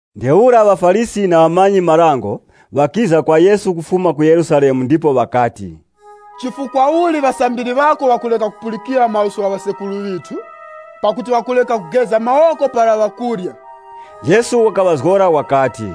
Ntheura ŵaFarisi na ŵamanyi-marango ŵakiza kwa Yesu kufuma ku Yerusalemu ndipo ŵakati, “Chifukwa uli ŵasambiri ŵako ŵakureka kupulikira maluso gha ŵasekuru ŵithu? Pakuti ŵakureka kugeza mawoko para ŵakurya.” Yesu wakaŵazgora wakati,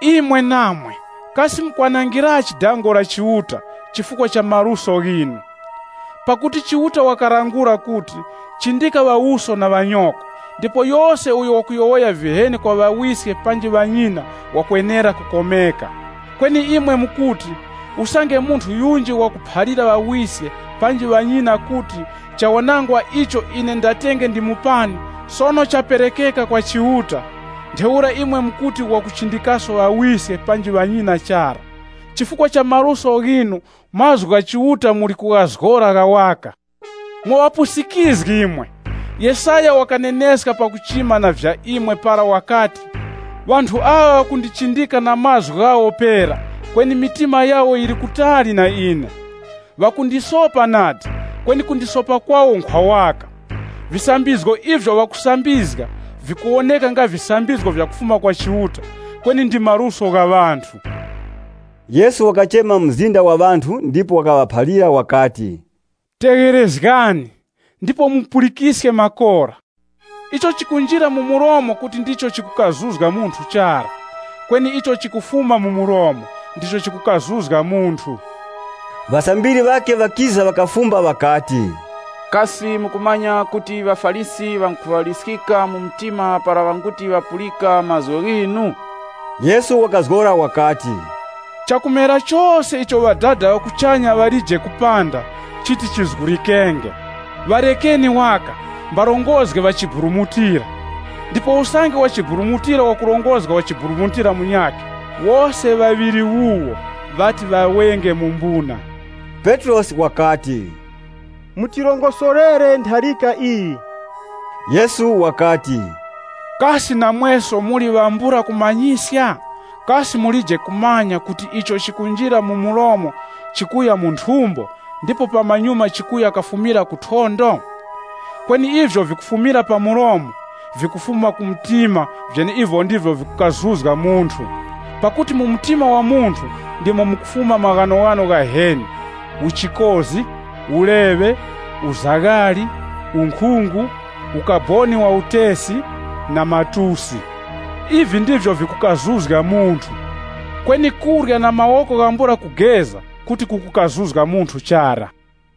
“Imwe namwe, kasi mukwanangirachi dango la Chiuta chifukwa cha maluso ghinu? Pakuti Chiuta wakalangula kuti, ‘Chindika ŵawuso na ŵanyoko,’ ndipo ‘Yose uyo wakutuka ŵawiske panji ŵanyina wakwenera kukomeka.’ Kweni imwe mukuti, ‘Usange munthu yunji wakuphalira ŵawiske panji ŵanyina kuti, Chawanangwa icho ine ndatenge ndimupani, sono chaperekeka kwa Chiuta.’ Ntheura imwe mukuti wakuchindikaso ŵawiske panji ŵanyina chara. Chifukwa cha maluso ghinu, mazgu gha Chiuta muli kughazgora gha waka. Mwa ŵapusikizgi imwe! Yesaya wakaneneska pakuchima na vya imwe para wakati, ‘Ŵanthu aŵa ŵakundichindika na mlomo wawo pera, kweni mtima wawo uli kutali na ine. (LXX) Ŵakundisopa nadi, kweni kusopa kwawo nkhwa waka. Visambizgo ivyo ŵakusambizga nga ndi vyenecho, kweni ndi maluso waka gha ŵanthu!’” Yesu wakachema mzinda wa ŵanthu ndipo wakaŵaphalira wakati, “Tegherezgani, ndipo mupulikiske makora. Icho chikunjira mu mlomo kuti ndicho chikukazuzga munthu chara, kweni icho chikufuma mu mlomo, ndicho chikukazuzga munthu.” Ŵasambiri ŵakhe ŵakiza ndipo ŵakafumba ŵakati, “Kasi mukumanya kuti ŵaFarisi ŵangukhuŵala mu mtima para ŵanguti ŵapulika mazgu ghinu?” Yesu wakazgora wakati, “Chakumera chose icho Ŵadada ŵa kuchanya ŵalije kupanda, chiti chizgulikenge. Ŵarekani waka. Iwo mbarongozgi ŵa chiburumutira. Ndipo usange wachiburumutira wakurongozga wachiburumutira munyakhe, wose ŵaŵiri wuwo ŵati ŵawenge mu mbuna.” Petrosi wakati, “Mutirongosorere ntharika iyi.” Yesu wakati, “Kasi namweso muli ŵambula kumanyiska? Kasi mulije kumanya kuti icho chikunjira mu mlomo chikuya mu nthumbo, ndipo pamanyuma chikuya kafumira ku thondo? Kweni ivyo vikufumira pa mlomo, vikufuma ku mtima vyeneivi ndivyo vikukazuzga munthu. Pakuti mu mtima wa munthu ndimo mukufuma maghanoghano ghaheni: uchikozi, uleŵe, uzaghali unkhungu, ukaboni wa utesi, na matusi. Ivi ndivyo vikukazuzga munthu. Kweni kurya na mawoko ghambula kugeza kuti kukukazuzga munthu chara.”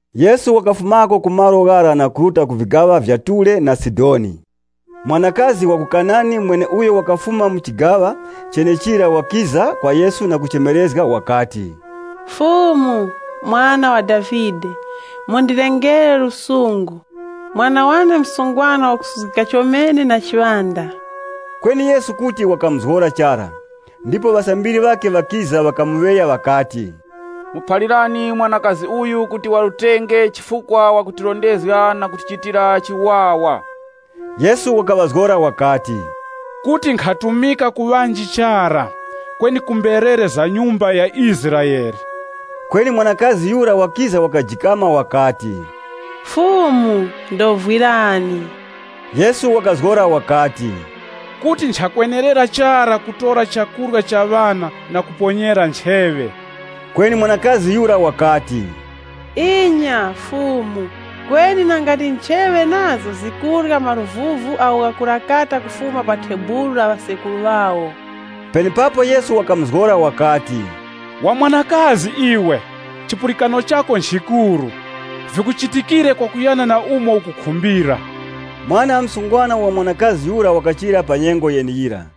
Yesu wakafumako ku malo ghara na kuruta ku vigaŵa vya Ture na Sidoni. Mwanakazi wa ku Kanani mweneuyo wakafuma mu chigaŵa chenechira wakiza kwa Yesu na kuchemerezga wakati, “Mwe Fumu, Mwana wa Davide mundilengere lusungu! Mwana wane msungwana wakusuzgika chomene na chiŵanda.” Kweni Yesu kuti wakamuzgora chara. Ndipo ŵasambiri ŵakhe ŵakiza, ŵakamuŵeya ŵakati, “Muphalirani uyu kuti warutenge chifukwa wakutirondezga na kutichitira chiwawa.” Yesu wakaŵazgora wakati, “Kuti nkhatumika ku ŵanji chara, kweni ku mberere za mbumba ya Israele.” Kweni mwanakazi yura wakiza wakajikama wakati, “Fumu ndovwirani!” Yesu wakazgora wakati, “Kuti nchakwenerera chara kutora chakurya cha ŵana na kuponyera ncheŵe.” Kweni mwanakazi yura wakati, “Inya, Fumu, kweni nanga ndi ncheŵe nazo zikurya maruvuvu agho ghakurakata kufuma pa thebulu la ŵasekuru ŵawo!” Penepapo Yesu wakamuzgora wakati, “Wa mwanakazi iwe, chipulikano chako nchikuru! Vikuchitikire kwakuyana na umo ukukhumbira.” Mwana msungwana wa mwanakazi yura wakachira pa nyengo yeneyira.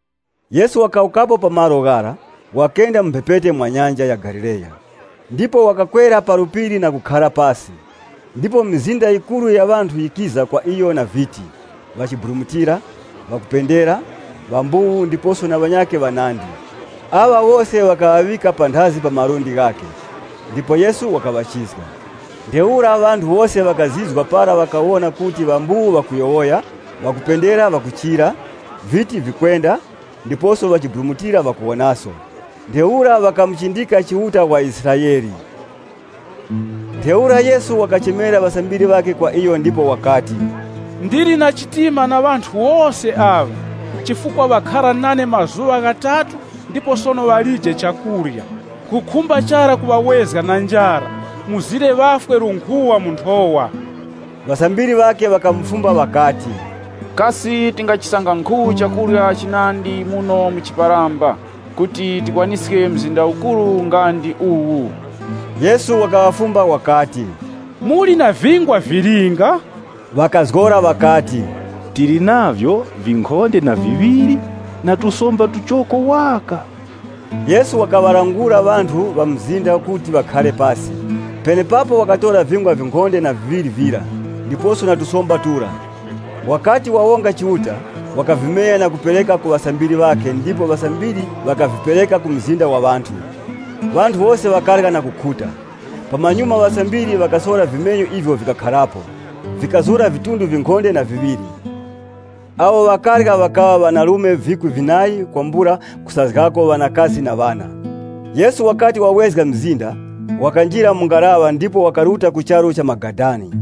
Yesu wakawukapo pa malo ghara, wakenda mu mphepete mwa Nyanja ya Galileya. Ndipo wakakwera pa phiri na kukhara pasi. Ndipo mizinda yikuru ya ŵanthu yikiza kwa iyo na viti, ŵachiburumutira, ŵakupendera, ŵambuwu ndiposo na ŵanyakhe ŵanandi. Aŵa wose ŵakaŵaŵika panthazi pa malundi ghakhe. Ndipo Yesu wakaŵachizga. Ntheura ŵanthu wose ŵakazizwa para ŵakawona kuti ŵambuwu ŵakuyowoya, ŵakupendera ŵakuchira, viti vikwenda, ndiposo ŵachiburumutira ŵakuwonaso. Ntheura ŵakamuchindika Chiuta wa Israele. Ntheura Yesu wakaŵachemera ŵasambiri ŵakhe kwa iyo ndipo wakati, “Ndili nawo na chiwuravi ŵanthu wose aŵa, chifukwa ŵakhara nane mazuŵa ghatatu ndipo sono ŵalije chakurya. Nkhukhumba chara kuŵawezga na njara, mzire ŵafwe lunkhuŵa mu nthowa.” Ŵasambiri ŵakhe ŵakamufumba ŵakati, “Kasi tingachisanga nkhu chakurya chinandi muno mu chiparamba, kuti tikwaniske mzinda ukuru nga ndi uwu.” Yesu wakaŵafumba wakati, “Muli na vingwa vilinga?” Ŵakazgora ŵakati, “Tili navyo vinkhonde na viŵiri na tusomba tuchoko waka.” Yesu wakaŵalangula ŵanthu ŵa mu mzinda kuti ŵakhare pasi. Penepapo wakatora vingwa vinkhonde na viŵiri vira, ndiposo na tusomba tura. Wakati wawonga Chiuta, wakavimenya na kupereka ku ŵasambiri ŵakhe ndipo ŵasambiri ŵakavipereka ku mzinda wa ŵanthu. Ŵanthu wose ŵakarya na kukhuta. Pamanyuma ŵasambiri ŵakasora vimenyu ivyo vikakharapo, vikazura vidunga vinkhonde na viŵiri. Awo ŵakarya ŵakaŵa ŵanarume vikwi vinayi kwambula kusazgako ŵanakazi na ŵana. Yesu wakati wawezga mzinda, wakanjira mu ngaraŵa ndipo wakaruta ku charu cha Magadani.